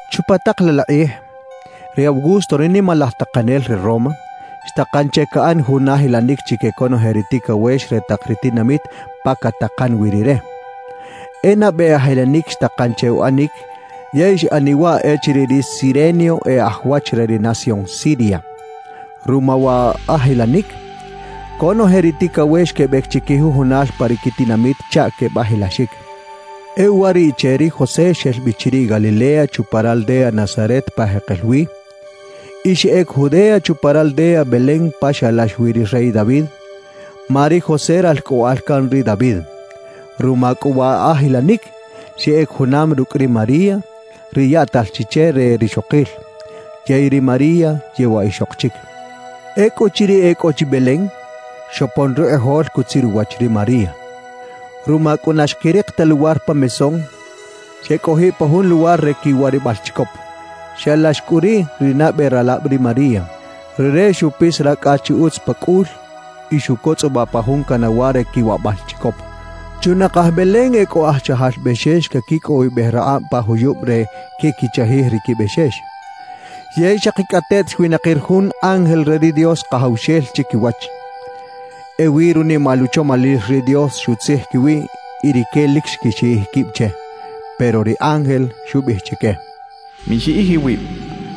Chupa tak laꞌ la kꞌij, ri Augusto ri nimalaj takanel re Roma, xtakan che caꞌan jun ajilanic chique conoje ri ticawex re tak ri tinamit pa catakan wi rire. E nabe ajilanic xtakan che uꞌanic, yey xꞌaniꞌ waꞌ echiriꞌ ri Cirenio e aj wach re ri nación Siria. Ruma wa ajilanic, conoje ri ticawex quebec chiquijujunal pa ri quitinamit chaꞌ quebajilaxic. E uwariꞌche ri José xel bi chiriꞌ Galilea chupa raldea Nazaret pa jekel wi, y xeꞌec Judea chupa raldea Belén pa xalax wi ri rey David, ma ri José ralcꞌoꞌal can ri David. Ruma cꞌu wa ajilanic, xeꞌec junam rucꞌ ri María, ri yaꞌtal chi che re rixokil. Yey ri María yewaꞌ ixok chic. Ecꞌuchiriꞌ e cꞌo chi Belén, xopon rukꞌijol cutzir uwach ri María. Ruma cꞌu na xquirik ta luwar pa mesón, xecꞌojiꞌ pa jun luwar re quiwarabal chicop. Xalax cꞌu riꞌ ri nabe ralab ri María. Rire xupis racꞌa chi utz pa cꞌul y xucotzꞌobaꞌ pa jun canawa re quiwaꞌbal chicop. Chunakaj Belén e cꞌo aj chajal bexex caquicꞌowibej rakꞌab pa juyub re quequichajij ri quibexex. Yey xakicꞌateꞌt xwinakir jun ángel re ri Dios Kajawxel chiquiwach. Ewi runimal uchomalil ri Dios xutzij quiwiꞌ y rique lic xquixiꞌij quib che. Pero ri ángel xubiꞌij chique: «Mixiꞌij iwib,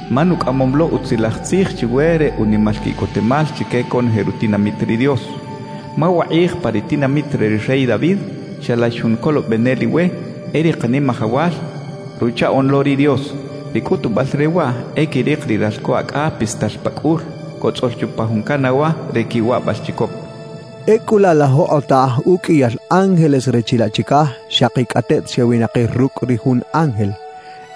ma nucꞌamom lo utzilaj tzij chiwe re unimal quiꞌcotemal chique conoje rutinamit ri Dios. Ma wakꞌij pa ri tinamit re ri rey David, xalax jun Colobenel iwe; e ri Kanimajawal, Ruchaꞌoꞌn lo ri Dios. Ri cꞌutubal re waꞌ e quirik ri ralco acꞌa pistal pa cꞌul, cotzꞌol chupa jun canawa re quiwaꞌbal chicop» xcha chique. Ecꞌu laꞌ la jokꞌotaj uqꞌuiyal ángeles re chilaꞌ chicaj xakicꞌateꞌt xewinakir rucꞌ ri jun ángel,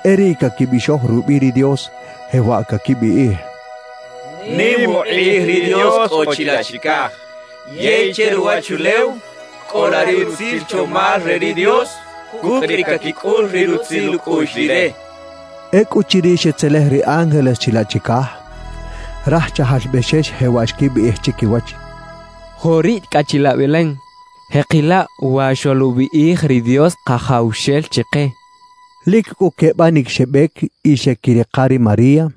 e riꞌ caquibixoj rubiꞌ ri Dios, jewaꞌ caquibiꞌij: «¡Nim ukꞌij ri Dios cꞌo chilaꞌ chicaj! Yey che ruwachulew, cꞌola ri utzil chomal re ri Dios cucꞌ ri caquicꞌul ri rutzil ucꞌuꞌx Rire» xechaꞌ. Ecꞌuchiriꞌ xetzelej ri ángeles chilaꞌ chicaj, raj chajal bexex jewaꞌ xquibiꞌij chiquiwach: «Joꞌ riꞌ cꞌa chilaꞌ Belén. Jeꞌkila wa xoluꞌbiꞌij ri Dios Kajawxel chike» xechaꞌ. Lic cꞌu quebanic xebec y xeꞌquirika ri María,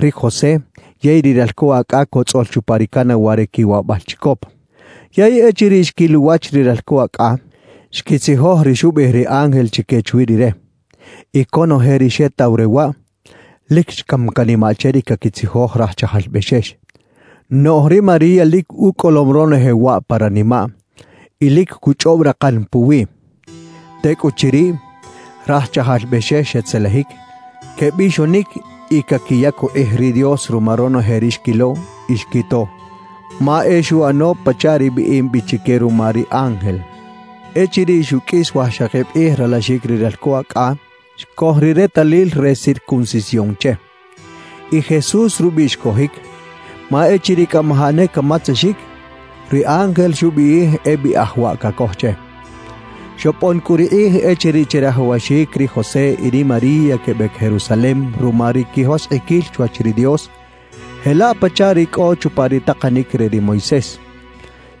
ri José yey ri ralco acꞌa cotzꞌol chupa ri canawa re quiwaꞌbal chicop. Yey echiriꞌ xquil uwach ri ralco acꞌa, xquitzijoj ri xubiꞌij ri ángel chique chwi Rire. Y conoje ri xetaw re waꞌ, lic xcam canimaꞌ che ri caquitzijoj raj chajal bexex. Noꞌj ri María lic ucꞌolom ronoje waꞌ pa ranimaꞌ y lic cuchꞌob rakan puwiꞌ. Tecꞌuchiriꞌ, raj chajal bexex xetzelejic, quebixonic y caquiyac ukꞌij ri Dios ruma ronoje ri xquilo y xquito, ma e xuꞌano pachaꞌ ri biꞌim bi chique ruma ri ángel. Echiriꞌ xuqꞌuis wajxakib kꞌij ralaxic ri ralco acꞌa, xcoj ri retalil re circuncisión che. Y Jesús rubiꞌ xcojic, ma echiriꞌ cꞌamajaꞌ ne camatzexic, ri ángel xubiꞌij e biꞌaj waꞌ cacoj che. Xopon cꞌu ri kꞌij echiriꞌ chirajawaxic ri José y ri María quebec Jerusalem ruma ri quijoskꞌiquil chwach ri Dios, jelaꞌ pachaꞌ ri cꞌo chupa ri takanic re ri Moisés.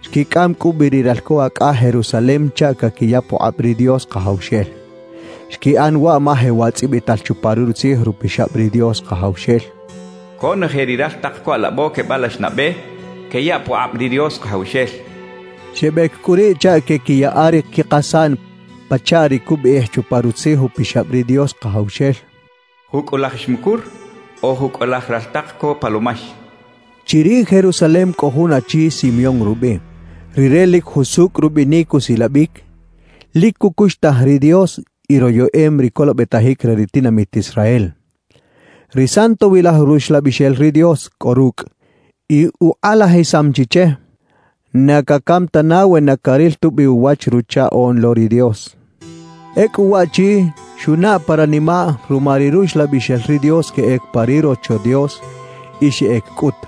Xquicꞌam cꞌu bi ri ralco acꞌa Jerusalem chaꞌ caquiya pukꞌab ri Dios Kajawxel. Xquiꞌan waꞌ ma jewaꞌ tzꞌibital chupa Rutzij Upixab ri Dios Kajawxel: «Conoje ri raltak co alabo quebalax nabe, queyaꞌ pukꞌab ri Dios Kajawxel» cachaꞌ. Xebec cꞌu riꞌ chaꞌ queꞌquiyaꞌa ri quikasaꞌn pachaꞌ ri cubiꞌij chupa Rutzij Upixab ri Dios Kajawxel: «Jucꞌulaj xmucur o jucꞌulaj raltak co palomax» cachaꞌ. Chiriꞌ Jerusalem cꞌo jun achi Simeón rubiꞌ. Rire lic jusucꞌ rubinic usilabic, lic cucuxtaj ri Dios y royeꞌem ri colobetajic re ri tinamit Israel. Ri Santowilaj Ruxlabixel ri Dios cꞌo rucꞌ y ukꞌalajisam chi che, na cacam tana we na caril tubi uwach Ruchaꞌoꞌn lo ri Dios. Ecꞌu waꞌchi xunaꞌ pa ranimaꞌ ruma ri Ruxlabixel ri Dios queꞌec pa ri Rocho Dios, y xeꞌec cꞌut.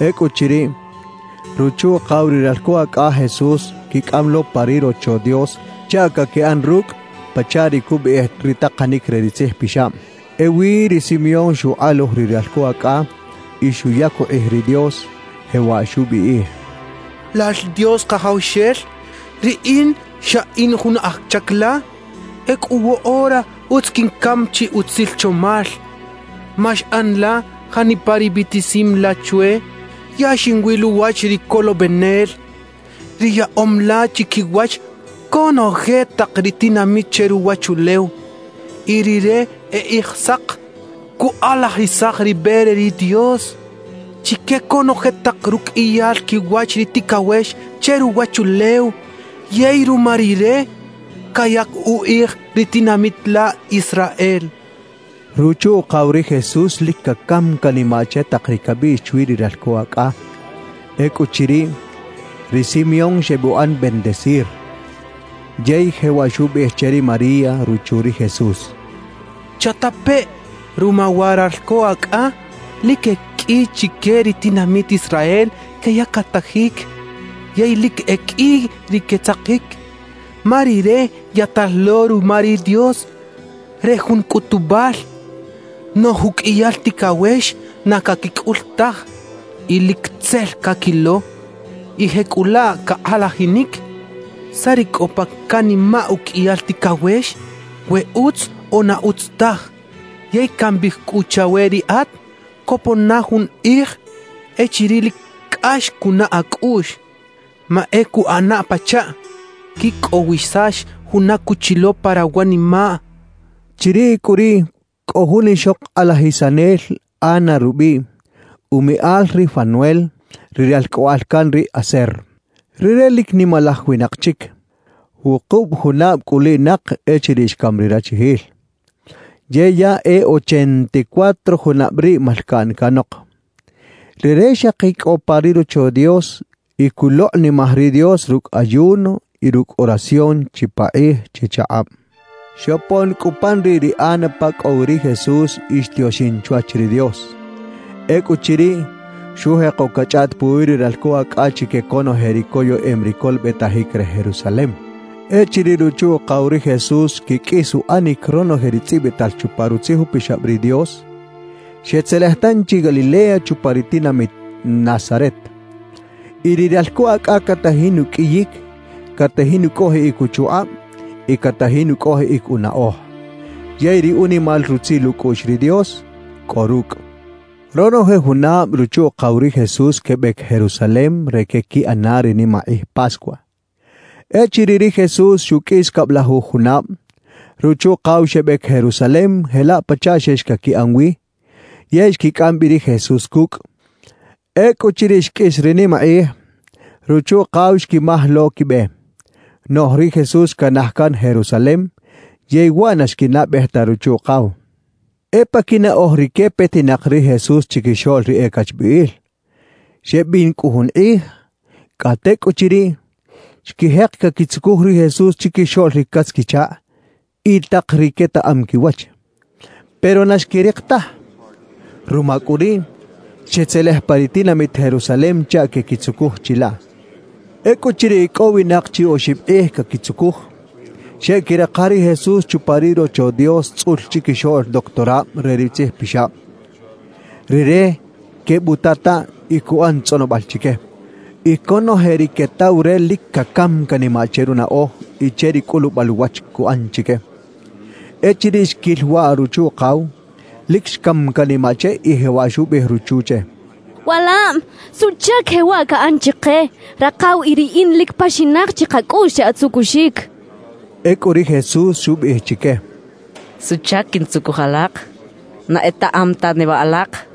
Ecꞌuchiriꞌ, ruchu-ukaw ri ralco acꞌa Jesús xquicꞌam lo pa ri Rocho Dios chaꞌ caquiꞌan rucꞌ pachaꞌ ri cubiꞌij ri takanic re ri Tzij Pixab. Ewi ri Simeón xukꞌaluj ri ralco acꞌa y xuyac ukꞌij ri Dios, jewaꞌ xubiꞌij: «Lal Dios Kajawxel, riꞌin xa in jun aj chac la. Ecꞌu woꞌora utz quincam chi utzil chomal, ma xꞌan la janipa ri biꞌtisim la chwe; ya xinwil uwach ri Colobenel, ri yaꞌom la chiquiwach conoje tak ri tinamit che ruwachulew. Y Rire e Kꞌijsak cukꞌalajisaj ri be re ri Dios chique conoje tak ruqꞌuiyal quiwach ri ticawex che ruwachulew, yey ruma Rire cayac ukꞌij ri tinamit la Israel» xchaꞌ. Ruchu-ukaw ri Jesús lic cacam canimaꞌ che tak ri cabiꞌx chwi ri ralco acꞌa. Ecꞌuchiriꞌ, ri Simeón xebuꞌan bendecir. Yey jewaꞌ xubiꞌij che ri María ruchu ri Jesús: —¡Chatapeꞌ! Ruma wa ralco acꞌa lic e qꞌui chique ri tinamit Israel queyactajic yey lic e qꞌui ri quetzakic. Ma Rire yaꞌtal lo ruma ri Dios re jun cꞌutubal; noꞌj uqꞌuiyal ticawex na caquicꞌul taj y lic tzel caquilo. Y jecꞌulaꞌ cakꞌalajinic saꞌ ri cꞌo pa canimaꞌ uqꞌuiyal ticawex, we utz o na utz taj. Yey cambiꞌij cꞌu chawe riꞌat: Copon na jun kꞌij echiriꞌ lic cꞌax cunaꞌ acꞌuꞌx, ma e cuꞌana pachaꞌ quicꞌowisax juna cuchilo pa rawanimaꞌ —xchaꞌ. Chiriꞌ cꞌu riꞌ cꞌo jun ixok kꞌalajisanel Ana rubiꞌ, umiꞌal ri Fanuel, ri ralcꞌoꞌal can ri Aser. Rire lic nimalaj winak chic. Wukub junab cꞌuliꞌnak echiriꞌ xcam ri rachijil, yey ya e ochenta y cuatro junab riꞌ malcaꞌn canok. Rire xaki cꞌo pa ri Rocho Dios y culokꞌnimaj ri Dios rucꞌ ayuno y rucꞌ oración chipakꞌij chichakꞌab. Xopon cꞌu pan riꞌ ri Ana pa cꞌo wi ri Jesús y xtioxin chwach ri Dios. Ecꞌuchiriꞌ, xujeko cachꞌaꞌt puwi ri ralco acꞌa chique conoje ri coyeꞌem ri colobetajic re Jerusalem. Echiriꞌ ruchu-ukaw ri Jesús xquiqꞌuis uꞌanic ronoje ri tzꞌibital chupa Rutzij Upixab ri Dios, xetzelej tanchi Galilea chupa ri tinamit Nazaret. Y ri ralco acꞌa catajin uqꞌuiyic, catajin ucꞌojiꞌic uchukꞌab y catajin ucꞌojiꞌic unaꞌoj. Yey ri unimal rutzil ucꞌuꞌx ri Dios cꞌo rucꞌ. Ronoje junab ruchu-ukaw ri Jesús quebec Jerusalem re queꞌquiꞌana ri nimakꞌij Pascua. Echiriꞌ ri Jesús xuqꞌuis cablajuj junab, ruchu-ukaw xebec Jerusalem jelaꞌ pachaꞌ xex caquiꞌan wi, yey xquicꞌam bi ri Jesús cucꞌ. Ecꞌuchiriꞌ xqꞌuis ri nimakꞌij, ruchu-ukaw xquimaj lo quibe. Noꞌj ri Jesús xcanaj can Jerusalem, yey waꞌ na xquinaꞌbej ta ruchu-ukaw. E pa quinaꞌoj rique petinak ri Jesús chiquixoꞌl ri e cachbiꞌil. Xebin cꞌu jun kꞌij; cꞌa tecꞌuchiriꞌ, xquijek caquitzucuj ri Jesús chiquixoꞌl ri catz-quichakꞌ y tak ri quetaꞌam quiwach, pero na xquirik taj. Ruma cꞌu riꞌ, xetzelej pa ri tinamit Jerusalem chaꞌ quequitzucuj chilaꞌ. Ecꞌuchiriꞌ icꞌowinak chi oxib kꞌij caquitzucuj, xeꞌquirika ri Jesús chupa ri Rocho Dios tzꞌul chiquixoꞌl doctorab re ri tzijpixab. Rire quebutataꞌ y cuꞌan tzꞌonobal chique. Y conoje ri quetaw re lic cacam canimaꞌ che runaꞌoj y che ri cꞌulubal uwach cuꞌan chique. Echiriꞌ xquil waꞌ ruchu-ukaw, lic xcam canimaꞌ che y jewaꞌ xubiꞌij ruchu che: —Walab, ¿suꞌchac jewaꞌ caꞌan chike? Rakaw y riꞌin lic paxinak chi kacꞌuꞌx che atzucuxic —xcha che. Ecꞌu ri Jesús xubiꞌij chique: —¿Suꞌchac quintzucuj alak? ¿Na etaꞌam ta neba alak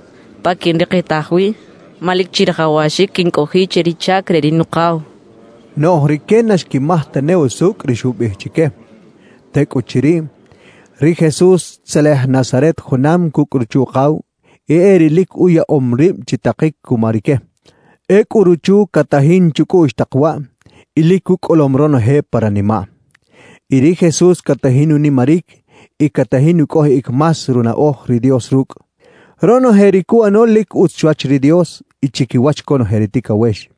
pa quinrikitaj wi? Ma lic chirajawaxic quincꞌojiꞌ che ri chac re ri Nukaw —xcha chique. Noꞌj rique na xquimaj tane usucꞌ ri xubiꞌij chique. Tecꞌuchiriꞌ, ri Jesús xtzelej Nazaret junam cucꞌ ruchu-ukaw y e riꞌ lic uyaꞌom rib chitakic cuma rique. Ecꞌu ruchu catajin chucꞌuꞌx tak waꞌ y lic ucꞌolom ronoje pa ranimaꞌ. Y ri Jesús catajin unimaric y catajin ucꞌojiꞌic más runaꞌoj ri Dios rucꞌ. Ronoje ri cuꞌano lic utz chwach ri Dios y chiquiwach conoje ri ticawex.